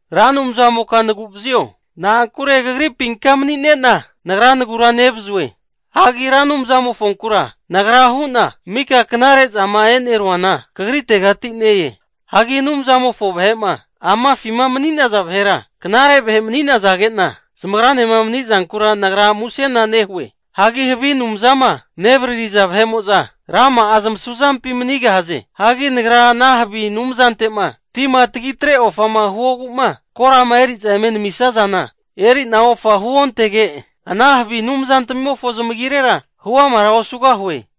Ra Anumzamoka nagu'vazio, na'ankure kagripinka mani'nena nagra nagura nevazue. Hagi Ra Anumzamofonkura nagra hu'na, mika knare zama e'neruana kagritegati ne-e. Hagi Anumzamofo vahe'ma amafima mani'naza vahera knare vahe mani'nazage'na, zamagranema mani'zankura nagra musena nehue. Hagi havi anumzama nevaririza vahe'mo'za, rama'a zamasu zampi manigahaze. Hagi nagra ana havi anumzante'ma tima tagitre ofama huogu'ma, korama eri'za eme namisazana erina ofa huontege, ana havi anumzantamimofo zamagirera huamara osugahue.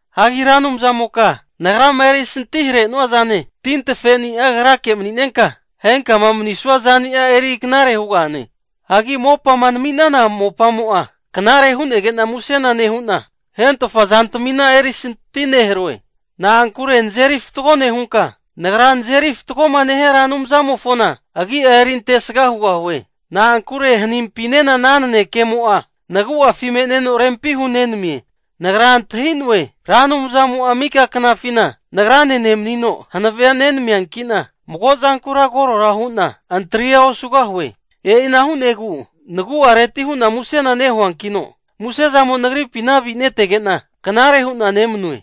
Hagi Ra Anumzamoka nagrama erisanti hare'nua zane, tintafeni'a Kagrake mani'nenka, henkama manisua zani'a eri knare hugahane. Hagi mopa'ma nami'nana mopamo'a, knare hu'nege'na musena nehu'na, hentofa zantamina erisanti neharoe. Nagra nazeri fatgoma nehia Ra Anumzamofona agi'a erintesaga hugahue. Na'ankure hanimpinena ana nanekemo'a nagu'afi me'neno rempi hunenamie. Nagra antahi'noe, Ra Anumzamo'a mika knafina nagrane nemanino hanavea nenamiankina, mago zankura korora hu'na antria osugahue. E'ina hu'negu nagu'areti hu'na muse nehuankino, musezamo nagripina avinetege'na knare hu'na nemanue.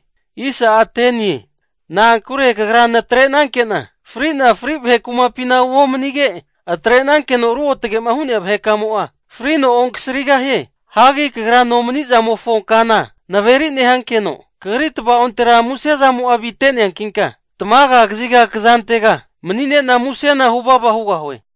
Na'ankure kagra natrenanke'na fri'na fri vahe kumapina uomanige, atrenankeno ruotagema hu'nea vahekamo'a frino onkasarigahie. Hagi kagra nomani'zamofo kana naveri nehankeno, kagri tava'ontera musezamo'a avineteankina tamaga kaziga kzantega mani'nena musena huvava hugahue.